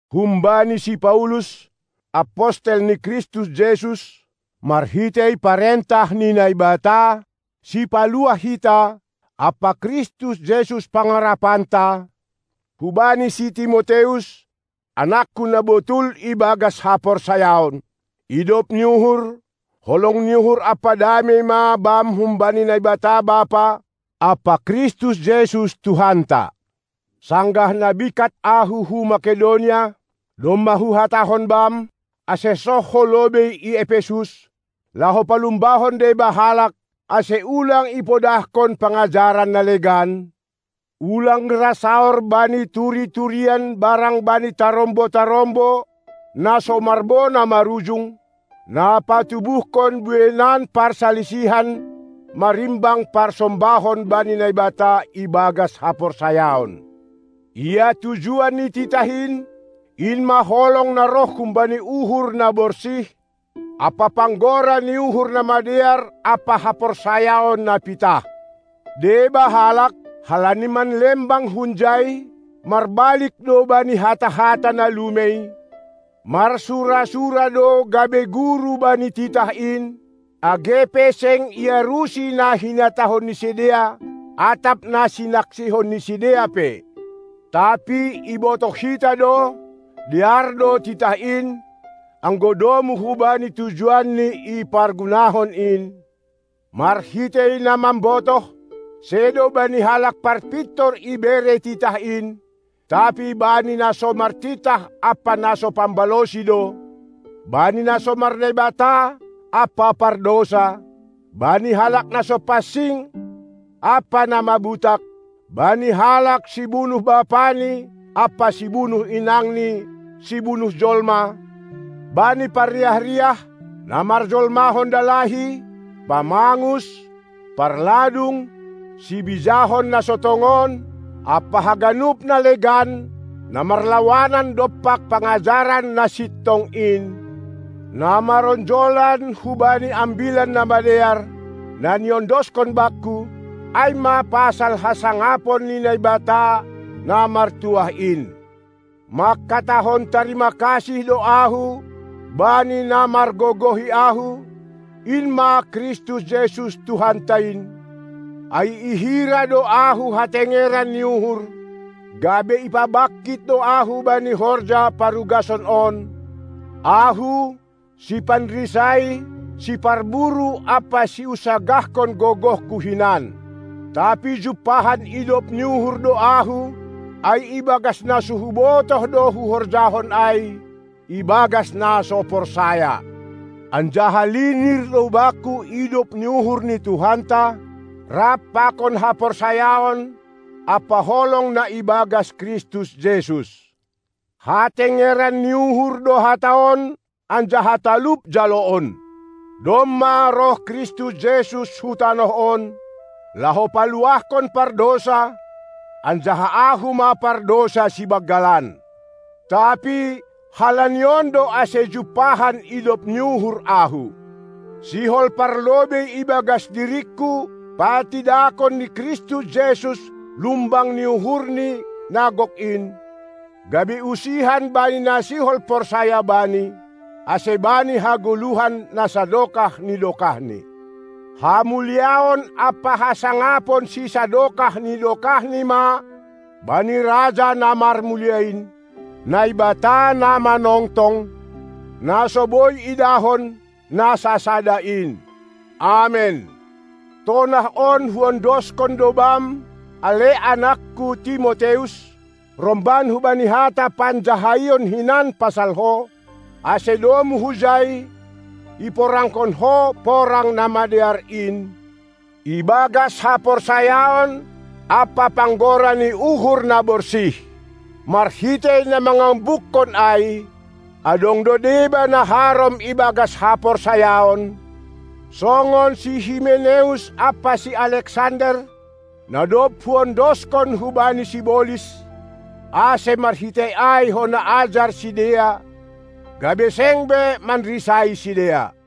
Humbani si Paulus, apostel ni Kristus Jesus, marhitei parentah ni Naibata, Sipaluah hita, ampa Kristus Jesus Pangarapanta, hubani si Timoteus, anakku na botul ibagas haporsayaon: Idop ni uhur, holong ni uhur ampa damei ma bam humbani Naibata Bapa ampa Kristus Jesus Tuhanta! Sanggah na bingkat ahu hu Makedonia, domma huhatahon bam, ase soh ho lobei i Epesus, laho palumbahon deba halak, ase ulang ipodahkon pangajaran na legan, ulang ra saor bani turi-turian barang bani tarombo-tarombo na so marbona marujung, na patubuhkon bueinan parsalisihan marimbang parsombahon bani Naibata ibagas haporsayaon. Ia tujuan ni titah in, in ma holong na roh humbani uhur na borsih ampa panggora ni uhur na madear ampa haporsayaon na pitah. Deba halak, halani manlembang hunjai, marbalik do bani hata-hata na lumei, marsura-sura do gabe guru bani titah in, age pe seng iarusi na hinatahon ni sidea atap na sinaksihon ni sidea pe. Tapi ibotoh hita do, dear do titah in, anggo domu hubani tujuanni ipargunahon in, marhitei na mambotoh, sedo bani halak parpintor ibere titah in, tapi bani na so martitah ampa na so pambalosi do, bani na so mar-Naibata ampa pardousa, bani halak na so pansing ampa na mabutak, bani halak sibunuh bapani ampa sibunuh inangni sibunuh jolma, bani parriah-riah, na marjolmahon dalahi, pamangus, parladung, sibijahon na so tongon, ampa haganup na legan na marlawanan dompak pangajaran na sintong in, na maronjolan hubani Ambilan Namadear, na niondoskon bakku, ai ma pasal hasangapon ni Naibata na martuah in. Mangkatahon tarima kasih do ahu bani na margogohi ahu, in ma Kristus Jesus Tuhanta in, ai ihira do ahu hatengeran ni uhur, gabe ipabangkit do ahu bani horja parugason on, ahu, sipanrisai, siparburu ampa siunsagahkon gogohku hinan. Tapi jumpahan idop ni uhur do ahu, ai ibagas na so hubotoh do huhorjahon ai, ibagas na so parsaya; anjaha linir do bakku idop ni uhur ni Tuhanta rap pakon haporsayaon ampa holong na ibagas Kristus Jesus. Hatengeran ni uhur do hata on anjaha talup jaloon: Domma roh Kristus Jesus hu tanoh on, laho paluahkon pardousa, anjaha ahu ma pardousa sibanggalan. Tapi halani on do ase jumpahan idop ni uhur ahu: Sihol parlobei ibagas diringku patidakon ni Kristus Jesus lumbang ni uhurni na gok in, gabe usihan bani na sihol porsaya Bani, ase bani hagoluhon na sadokah ni dokahni. Hamuliaon ampa hasangapon sisadokah ni dokahni ma bani Raja na marmulia in, Naibata na manongtong, na so boi idahon, na sasada in! Amen. Tonah on huondoskon do bam, ale anakku Timoteus, romban hubani hata panjahaion hinan pasal ho, ase domu hujai iporangkon ho porang na madear in, ibagas haporsayaon ampa panggora ni uhur na borsih. Marhitei na mangambukkon ai, adong do deba na harom ibagas haporsayaon, songon si Himeneus ampa si Aleksander, na dob huondoskon hubani sibolis, ase marhitei ai hona ajar sidea, gabe seng be manrisai sidea.